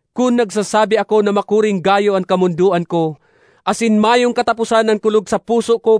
kun nagsasabi ako na makuring gayo an kamondoan ko asin mayong kataposan an kulog sa puso ko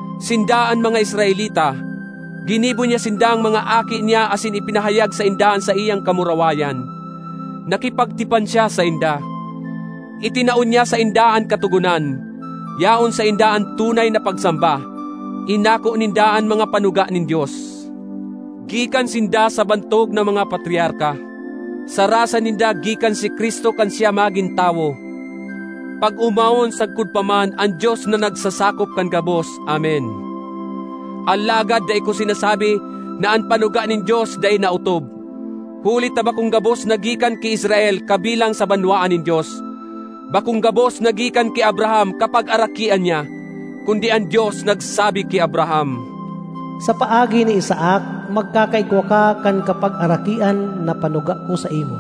Sinda an mga Israelita; ginibo niya sindang mga aki niya asin ipinahayag sainda an saiyang kamurawayan. Nakipagtipan siya sainda; itinao niya sainda an Katogonan. Yaon sainda an tunay na pagsamba; inako ninda an mga panuga nin Dios. Gikan sinda sa bantog na mga Patriarka; sa rasa ninda gikan si Cristo kan siya magin tawo. Pag-omawon sagkod pa man an Dios na nagsasakop kan gabos! Amen. Alagad dai ko sinasabi na an panuga nin Dios dai naotob; huli ta bakong gabos na gikan ki Israel kabilang sa banwaan nin Dios. Bakong gabos na gikan ki Abraham kapagarakian niya; kundi an Dios nagsabi ki Abraham, “Sa paagi ni Isaac, magkakaigwa ka kan kapagarakian na panuga ko saimo.”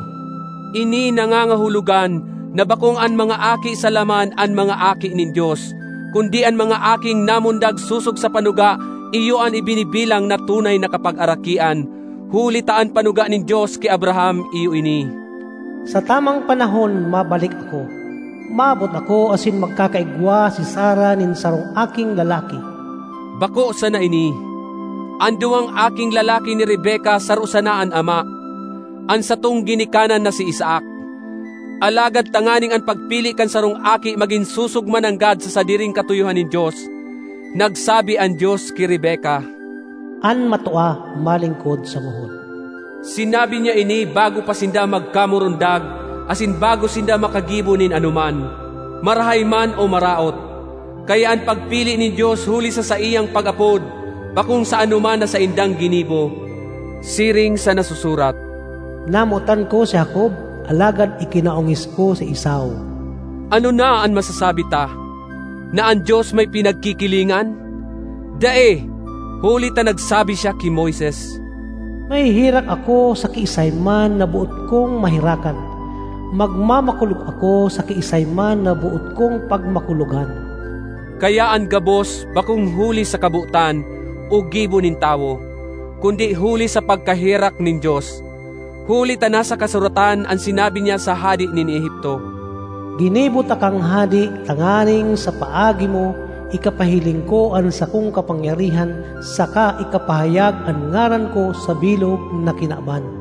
Ini nangangahulogan na bakong an mga aki sa laman an mga aki nin Dios; kundi an mga aking namundag sosog sa panuga, iyo an ibinibilang na tunay na kapagarakian. Huli ta an panuga nin Dios ki Abraham iyo ini: “Sa tamang panahon mabalik ako, maabot ako asin magkakaigwa si Sara nin sarong aking lalaki.” Bako sana ini. An duwang aking lalaki ni Rebeca saro sana an ama, an satong ginikanan na si Isaac. Alagad tanganing an pagpili kan sarong aki magin sosog mananggad sa sadiring katuyohan nin Dios, nagsabi an Dios ki Rebeca, “An matua malingkod sa ngohod.” Sinabi niya ini bago pa sinda magkamurundag asin bago sinda makagibo nin anoman, marahay man o maraot; kaya an pagpili nin Dios huli sa saiyang pag-apod, bakong sa anoman na saindang ginibo. Siring sa nasusurat, “Namotan ko si Jacob, alagad ikinaongis ko si Esau.” Ano na an masasabi ta? Na an Dios may pinagkikilingan? Dai. Huli ta nagsabi siya ki Moises, “Maheherak ako sa kiisay man na boot kong maherakan; magmamakulog ako sa kiisay man na boot kong pagmakulogan.” Kaya an gabos bakong huli sa kabotan o gibo nin tawo, kundi huli sa pagkaherak nin Dios. Huli ta nasa kasuratan an sinabi niya sa hade nin Egipto, “Ginibo takang hade tanganing sa paagi mo, ikapahiling ko an sakong kapangyarihan saka ikapahayag an ngaran ko sa bilog na kinaban.”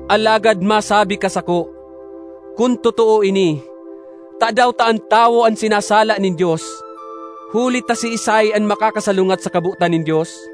Alagad masabi ka sako, “Kun totoo ini, tadaw ta an tawo an sinasala nin Dios? Huli ta siisay an makakasalungat sa kabotan nin Dios?”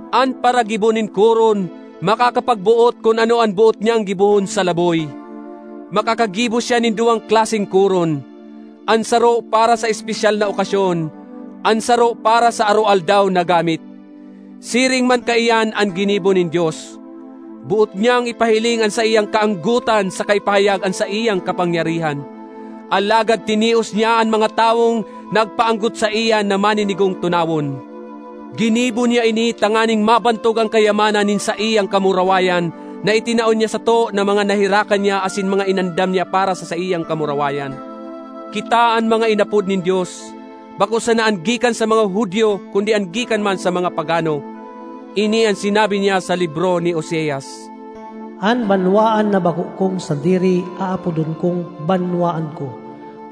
An paragibo nin koron makakapagboot kun ano an boot niyang gibohon sa laboy; makakagibo siya nin duwang klaseng koron: an saro para sa espesyal na okasyon, an saro para sa aroaldaw na gamit. Siring man kaiyan an ginibo nin Dios. Boot niyang ipahiling an saiyang kaanggotan saka ipahayag an saiyang kapangyarihan. Alagad tinios niya an mga tawong nagpaanggot saiya na maninigong tunawon. Ginibo niya ini tanganing mabantog an kayamanan nin saiyang kamurawayan na itinao niya sato na mga naherakan niya asin mga inandam niya para sa saiyang kamurawayan. Kita an mga inapod nin Dios, bako sana an gikan sa mga Judio kundi an gikan man sa mga pagano. Ini an sinabi niya sa libro ni Oseas: “An banwaan na bako kong sadiri, aapodon kong ‘banwaan ko’;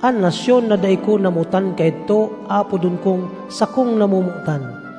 an nasyon na dai ko namotan kaidto, aapodon kong ‘sakong namomotan.’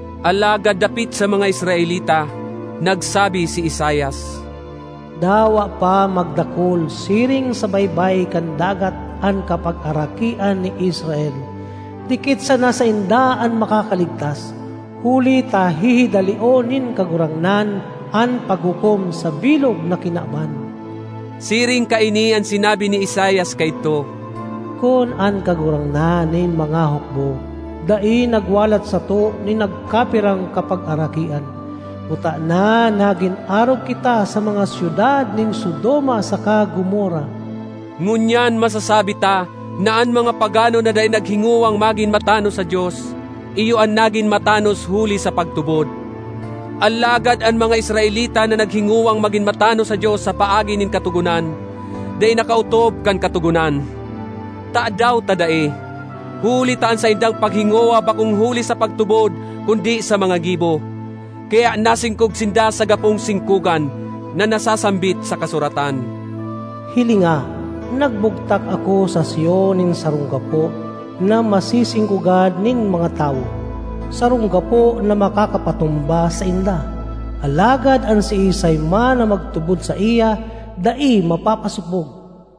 Alagad dapit sa mga Israelita, nagsabi si Isaias, “Dawa pa magdakul siring sa baybay kan dagat an kapagarakian ni Israel, dikit sana sainda an makakaligtas, huli ta hihidalion nin Kagurangnan an paghukom sa bilog na kinaban.” Siring kaini an sinabi ni Isaias kaidto, “Kun an Kagurangnan nin mga hukbo dai nagwalat sato nin nagkapirang kapagarakian, kutana nagin arog kita sa mga syudad nin Sodoma saka Gomorra.” Ngunyan masasabi ta na an mga pagano na dai naghingowang magin matanos sa Dios, iyo an nagin matanos huli sa pagtubod. Alagad an mga Israelita na naghingowang magin matanos sa Dios sa paagi nin katogonan, dai nakaotob kan katogonan. Tadaw ta dai? Huli ta an saindang paghingowa bakong huli sa pagtubod kundi sa mga gibo. Kaya nasingkog sinda sa “gapong singkogan” na nasasambit sa kasuratan, “Hilinga, nagbugtak ako sa Sion nin sarong gapo na masisingkogan nin mga tawo, sarong gapo na makakapatumba sainda. Alagad an siisay man na magtubod saiya, dai mapapasopog.”